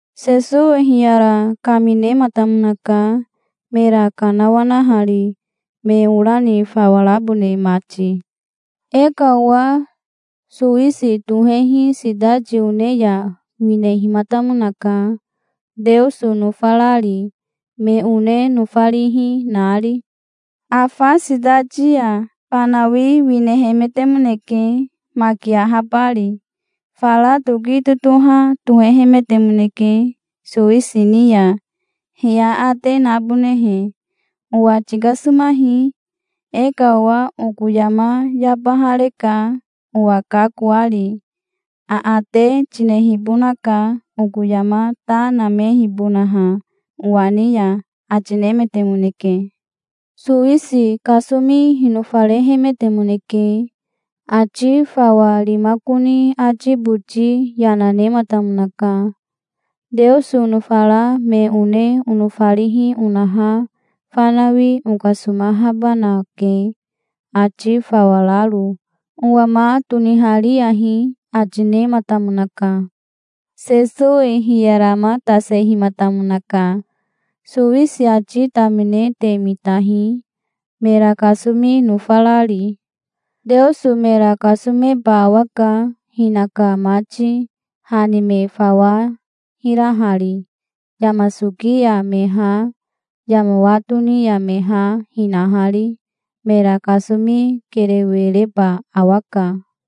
Sesowi hiyara kaminematamonaka mera kanawanahari, me ora ni fawa rabone mati. "E ka owa sowisi tohehi sitati one ya winehimatamonaka, Teoso nofarari, me one nofarihi nari. Afa sitati ya fanawi winehemetemoneke, maki ahabari. Fara toki totoha tohehemetemoneke sowisi ni ya, he aate nabonehe. 'Owa tikasomahi. E ka owa oko yama yabahareka, owa kakoari. Aate tinehibonaka oko yama ta namehibonaha owa ni ya', ati nemetemoneke". "Sowisi kasomi hinofarehemetemoneke. Ati fawa rimakoni ati boti yana nematamonaka. 'Teoso onofara me one onofarihi onaha fanawi okasomahabanake, ati fawa raro. Owa ma tonihariyahi', ati nematamonaka". Sesowi hiyaramatasehimatamonaka. "Sowisi ati tamine te mitahi, mera kasomi nofarari. Teoso mera kasomeba awaka, hinaka mati, ha ni me fawa hirahari, yama soki ya me ha, yama wa toni ya me ha, hinahari. Mera kasomi kerewe reba awaka.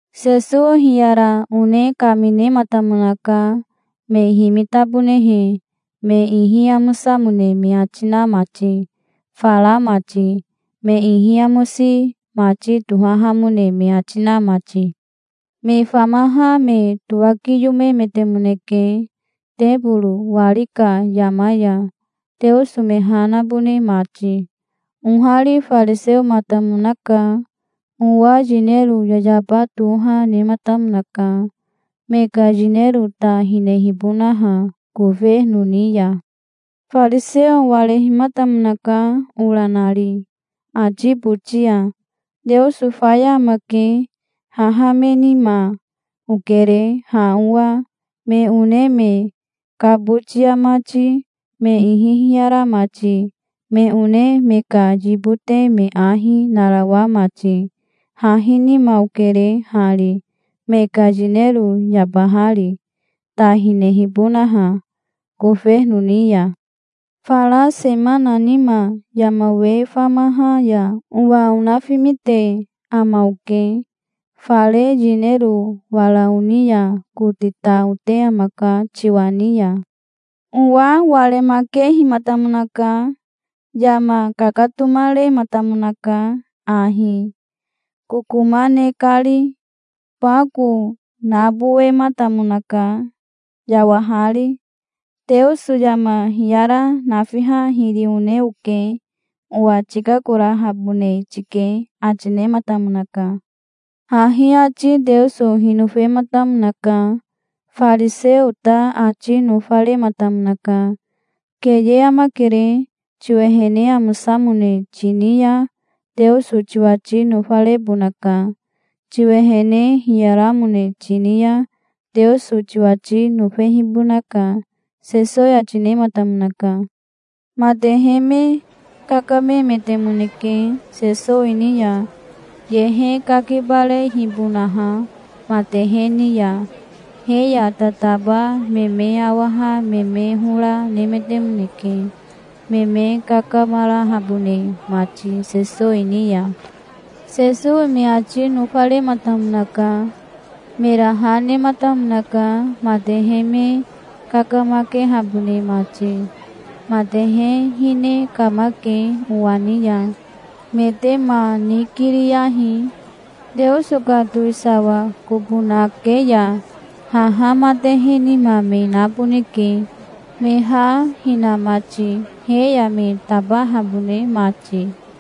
Sesowi hiyara one kaminematamonaka, me himitabonehe, me ihi amosamone me ati na mati, fara mati, me ihi amosi mati tohahamone me ati na mati. "Me famaha me towakiyomemetemoneke teboro wari ka yama ya, Teoso me ha nabone mati. Ohari fariseomatamonaka. Owa yinero yayaba toha nematamonaka, me ka yinero ta hinehibonaha kofeno ni ya. Fariseo warehimatamonaka ora nari ati boti ya. 'Teoso faya amake. Haha me nima okere, ha owa, me one me kabotia mati, me ihi hiyara mati, me one me ka yibote me ahi narawa mati. Hahi nima okere hari, me ka yinero yabahari, ta hinehibonaha kofeno ni ya. Fara semana nima yama we famaha ya owa onafimite ama oke. Fare yinero wara oni ya kote ta ote amaka tiwa ni ya'". "Owa waremakehimatamonaka. Yama kakatomarematamonaka ahi, kokoma ne kari. Bako nabowematamonaka, yawahari. 'Teoso yama hiyara nafiha hiri one oke. Owa tikakorahabone tike', ati nematamonaka". "Hahi ati Teoso hinofematamonaka. Fariseo ta ati nofarematamonaka. Keye amakere. Tiwehene amosamone tini ya Teoso tiwati nofarebonaka. Tiwehene hiyaramone tini ya Teoso tiwati nofehibonaka", Sesowi ati nematamonaka. Matehe me kakamemetemoneke Sesowi ni ya, yehe kakibarehibonaha matehe ni ya. He ya tataba me me awaha me me hora nemetemoneke, me me kakamarahabone mati Sesowi ni ya. Sesowi me ati nofarematamonaka. Mera ha nematamonaka, matehe me kakamakehabone mati. "Matehe hine kamake owa ni ya. Me te ma nikiriyahi. Teoso ka towisawa kobo nake ya haha matehe nima me naboneke me ha hina mati, he ya me tabahabone mati.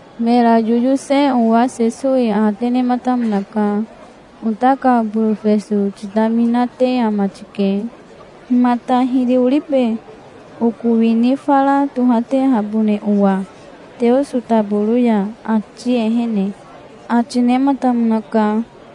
Mera yoyose owa Sesowi aate nematamonaka. "Ota ka borofeso titaminate ama tike. Himata hiri oribe, oko wini fara tohatehabone owa Teoso taboro ya, ati ehene?" ati nematamonaka.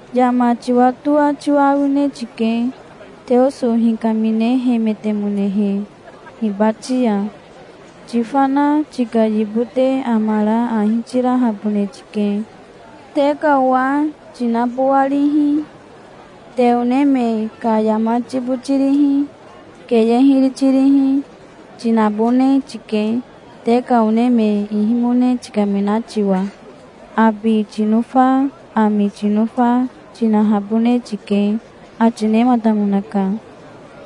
Yama tiwatoa tiwa awine tike, Teoso hikaminehemetemonehe hibati ya. 'Tifana tika yibote amara ahi tirahabone tike. Te ka owa tinabowarihi, te one me ka yama tibotirihi, keye hiri tirihi, tinabone tike, te ka one me ihimone tikamina tiwa. Abi tinofa, ami tinofa, tinahabone tike'", ati nematamonaka.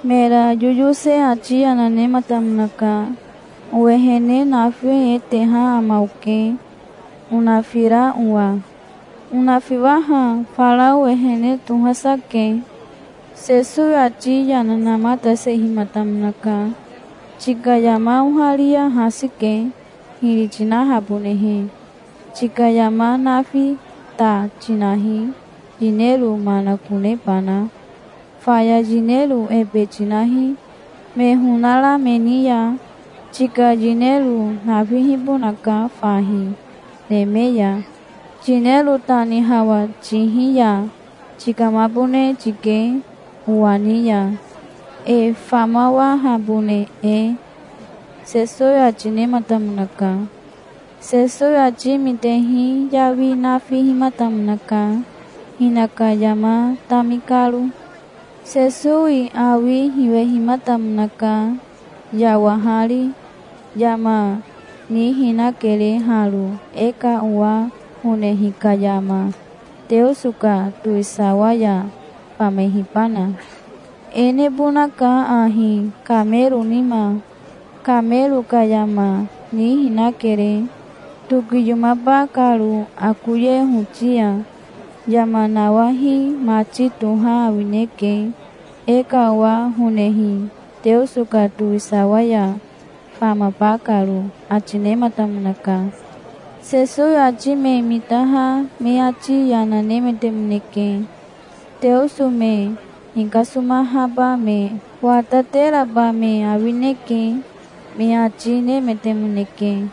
Mera yoyose ati yana nematamonaka. "Owehene nafi e teha ama oke, onafira owa. Onafiwaha fara owehene tohasa ke". Sesowi ati yana namatasehimatamonaka. "Tika yama oharia hasi ke, hiri tinahabonehe. Tika yama nafi ta tinahi, yinero manakonebana. Faya yinero ebe tinahi, me honara me ni ya. Tika yinero nafihibonaka fahi, neme ya. Yinero ta ni hawa tihi ya tikamabone tike owa ni ya, e famawahabone e", Sesowi ati nematamonaka. Sesowi ati mitehi yawi nafihimatamonaka, hinaka yama tami karo. Sesowi awi hiwehimatamonaka, yawahari. "Yama nihinakere haro, e ka owa honehi ka yama, Teoso ka towisawa ya famehibana. E nebonaka ahi, kamero nima. Kamero ka yama nihinakere, tokiyomaba karo akoye hoti ya. Yama nawahi mati toha awineke, e ka owa honehi Teoso ka towisawa ya famaba karo", ati nematamonaka. Sesowi ati me mitaha me ati yana nemetemoneke. "Teoso me hikasomahaba me watateraba me awineke", me ati nemetemoneke.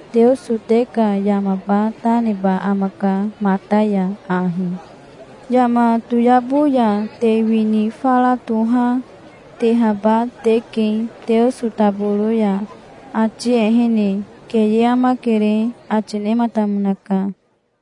Teoso te ka yamaba ta neba amaka mata ya ahi. Yama toyabo ya te wini fara toha, tehaba teke Teoso taboro ya, ati ehene. Keye amakere", ati nematamonaka.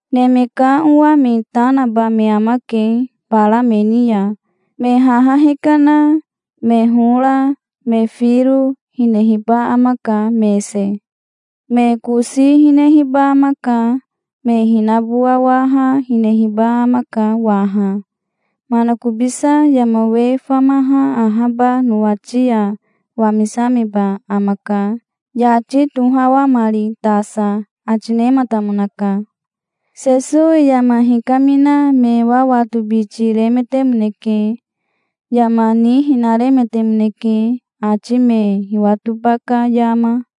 Neme ka Owa me ta naba me amake bara me ni ya. Me haha hikana, me hora, me firo, hinehiba amaka, mese. Me kosi hinehiba amaka. Me hinabowawaha hinehiba amaka waha. Manakobisa yama we famaha ahaba nowati ya wamisameba amaka yati tohawamari tasa", ati nematamonaka. Sesowi yama hikamina me wawatobiti remetemoneke. Yama nihinaremetemoneke, ati me hiwatoba ka yama.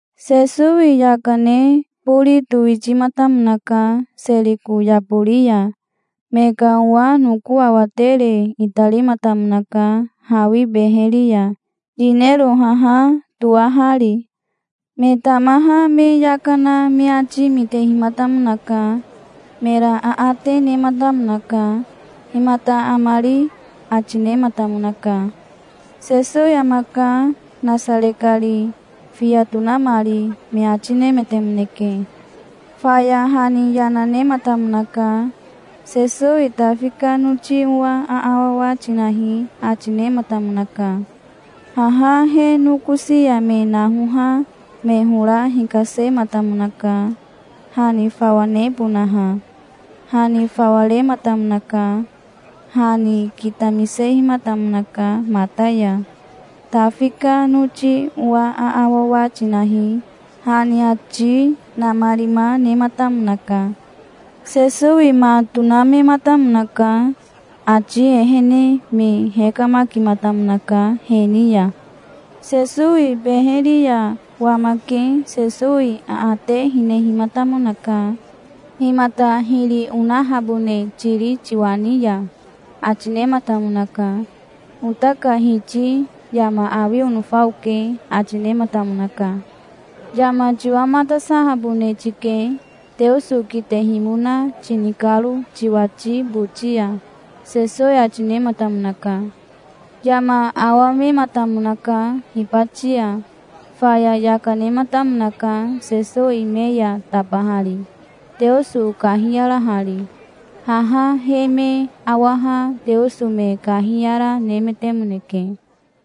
Sesowi yaka ne bori towitimatamonaka Seriko yabori ya. Me ka owa noko awatere itarimatamonaka hawi beheri ya, yinero haha toahari. Me tamaha me yaka na me ati mitehimatamonaka. Mera aate nematamonaka. "Himata amari?" ati nematamonaka. "Sesowi amaka, Nasare kari, fiya tonamari", me ati nemetemoneke. Faya ha ni yana nematamonaka. "Sesowi Tafi ka noti owa aawawa tinahi", ati nematamonaka. Haha he nokosi ya me nahoha me hora hikasematamonaka, ha ni fawa nebonaha. Ha ni fawa rematamonaka. Ha ni kitamisehimatamonaka mata ya. "Tafi ka noti owa aawawa tinahi", ha ni ati namarima nematamonaka. Sesowi ma tonamematamonaka. Ati ehene me hekamakimatamonaka he ni ya. Sesowi beheri ya wamake Sesowi aate hinehimatamonaka. "Himata hiri onahabone tiri tiwa ni ya?" ati nematamonaka. "Ota ka Hiti yama awi onofa oke", ati nematamonaka. "Yama tiwamatasahabone tike, Teoso kitehimona tini karo tiwati boti ya", Sesowi ati nematamonaka. Yama awamematamonaka hibati ya. Faya yaka nematamonaka Sesowi me ya tabahari, Teoso kahiyarahari. Haha he me awaha Teoso me kahiyara nemetemoneke.